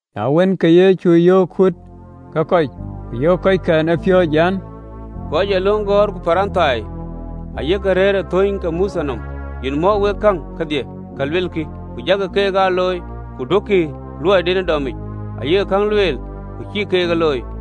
Na wën, ke Yecu yöök kuut ke kɔc, ku yöök kɔckɛn ë piööcë, an, “Kɔc ë löŋ gɔ̈ɔ̈r ku Parithai ayek rëër ë thöny ë Mothe nɔm. Yen mɔ̈k wek käŋ kedhie ka luelkï, ku jakï keek aa looi, ku duökï luɔiden dɔmic, ayek käŋ lueel, ku acïkï keek ë looi.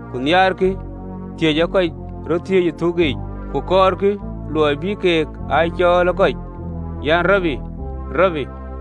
ku nhiaarkï thiëc ee kɔc röt thiëëc ë thuk yiic, ku kɔɔrkï luɔi bï keek aa cɔɔl ë kɔc, an ‘Rabi, Rabi.’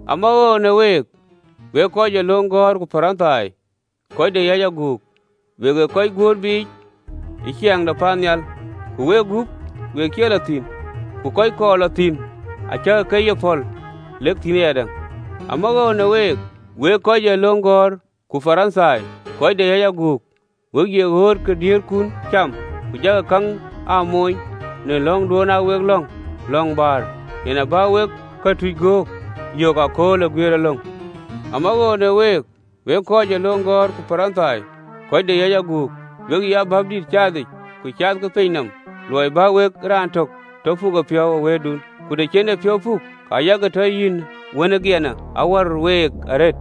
“Amawoou në week, wek kɔc ë löŋ gɔ̈ɔ̈r ku Parithai, kɔc de yäc aguk! Wek ë kɔc guöör biic ë Ciɛɛŋ de paannhial, wegup wek cie lɔ thïn, ku kɔc kɔɔr lɔ thïn acäkï ke ye päl lɔ thïn ayadäŋ. Amawoou në week wek kɔc ë löŋ gɔ̈ɔ̈r ku Parithai kɔc de yäc aguk! We ye ɣööt ke diëërthum cam, ku jakï käŋ aa moony në lɔ̈ŋduön aa wek lɔ̈ŋ, lɔ̈ŋ bäär, yen abä wek këtuc gök yök ëkööl ë guiëërëlöŋ. “Amawoou në week, wek kɔc ë löŋ gɔ̈ɔ̈r ku Parithai, kɔc de yäc aguk! We ye Wɛ̈ɛ̈r caathic ku caathkï piny nɔm luɔi bä wek raan tök tɔ puk epiɔ̈u ë wëëtdun, ku të cï en epiɔ̈u puk, ke yak tɔ ye wën ë giɛna awär week arëët!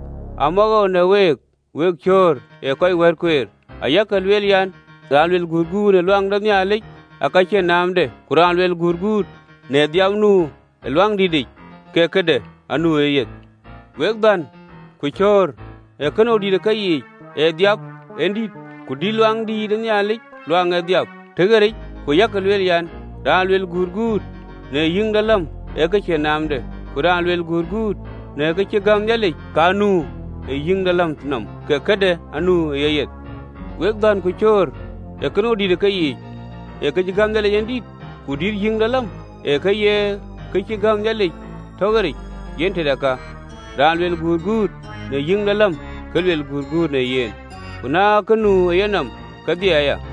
“Amawoou në week, wek cöör ë kɔc wat kueer, ayak lueel an, ‘Raan luel gutguut në Luaŋdït, ee ke cïn naamde, ku raan luel gutguut në adhääp nu ë Luaŋdïtic, ke këdäŋ anu ë yeyeth.’ Wek dhän ku cöör! Ee kënou de dït ë keyiic, adhääp en dït, ku dït Luaŋdït, eeŋö ë adhääp tɔ ɣeric? Ku yak lueel aya an, ‘Raan luel gutguut në yïïŋ de läm, ee kë cïn naamde, ku raan luel gutguut në kë cï gäm Nhialic kë nu ë yïïŋ de läm nɔm, ke këdäŋ anu ë yeyeth.’ Wek dhän ku cöör! Ee kënou dït ë keyiic, ee kë cï gäm Nhialic yen dït, ku dït yïïŋ de läm, ee kë cï gäm Nhialic tɔ ɣeric? Yen tëde ka, raan luel gutguut në yïïŋ de läm, aluel gutguut në yen, ku në ka nu ë yenɔm kedhie aya,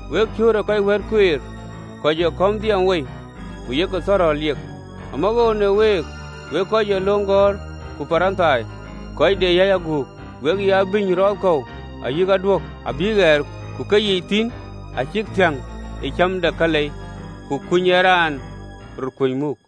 Wek cöör ë kɔc wat kueer, kɔc ee kɔ̈m dhiɛɛm wei, ku yak thɔ̈rɔ̈l liek. “Amawoou në week, wek kɔc ë löŋ gɔ̈ɔ̈r ku Parithai, kɔc de yäc aguk! We ye abïny rɔɔth kɔ̈u ayï aduök abïk piath, ku keyiic thïn acïk thiäŋ ë cäm de kalei, ku kuny ee raan rɔt kuöc muk.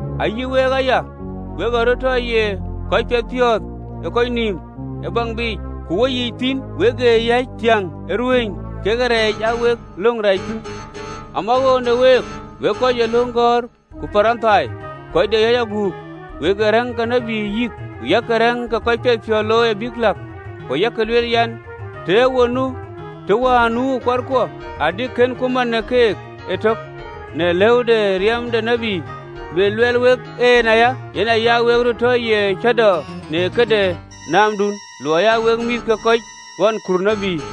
Ayï week aya, wek ee röt tɔ ye kɔc piɛthpiɔ̈ɔ̈th ë kɔc nïïm ë baŋ biic, ku weyiic thïn, wek ë yäc thiäŋ ë ruëëny kekë reec aa wek löŋ rɛɛc piŋ. “Amawoou në week, wek kɔc ë löŋ gɔ̈ɔ̈r ku Parithai, kɔc de yäc aguk! Wek ee rɛ̈ŋ ke tït yïk, ku yak rɛ̈ŋ ke kɔc piɛthpiɔ̈ɔ̈th looi abïk läk, ku yak lueel an, ‘Të ë wo nu të wään nu kuarkuɔ, adï kënku mat në keek ëtök në lëu de riɛm de tït. Luɛl luɛɛl wek en aya, yen aya wek röt tɔ ye cäätɔɔ në këde nɔmdun, luɔi aa wek kɔ̈th ke kɔc ɣɔn kur tït!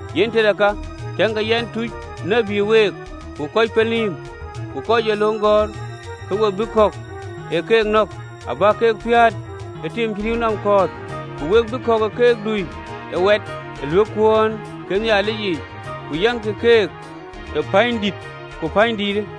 Yen tëde ka, tiëŋkï, yɛn, tuc tït week, ku röör pelnïïm, ku kɔc ë löŋ gɔ̈ɔ̈r, ku we bï kɔ̈k ë keek nɔ̈k abäk ke piäät ë tiim cï rïïu nïïm kɔ̈ɔ̈th, ku we bï kɔ̈k ë keek dui ë wɛt ë ɣöötkuön ë Nhialic yiic, ku yaŋkï keek në pänydït tök ku lakï ë pänydït däŋë.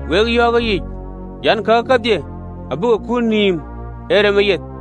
Wek yɔ̈ɔ̈k ë yic an, Kake kedhie abï ke kut nïïm ë remë yeth!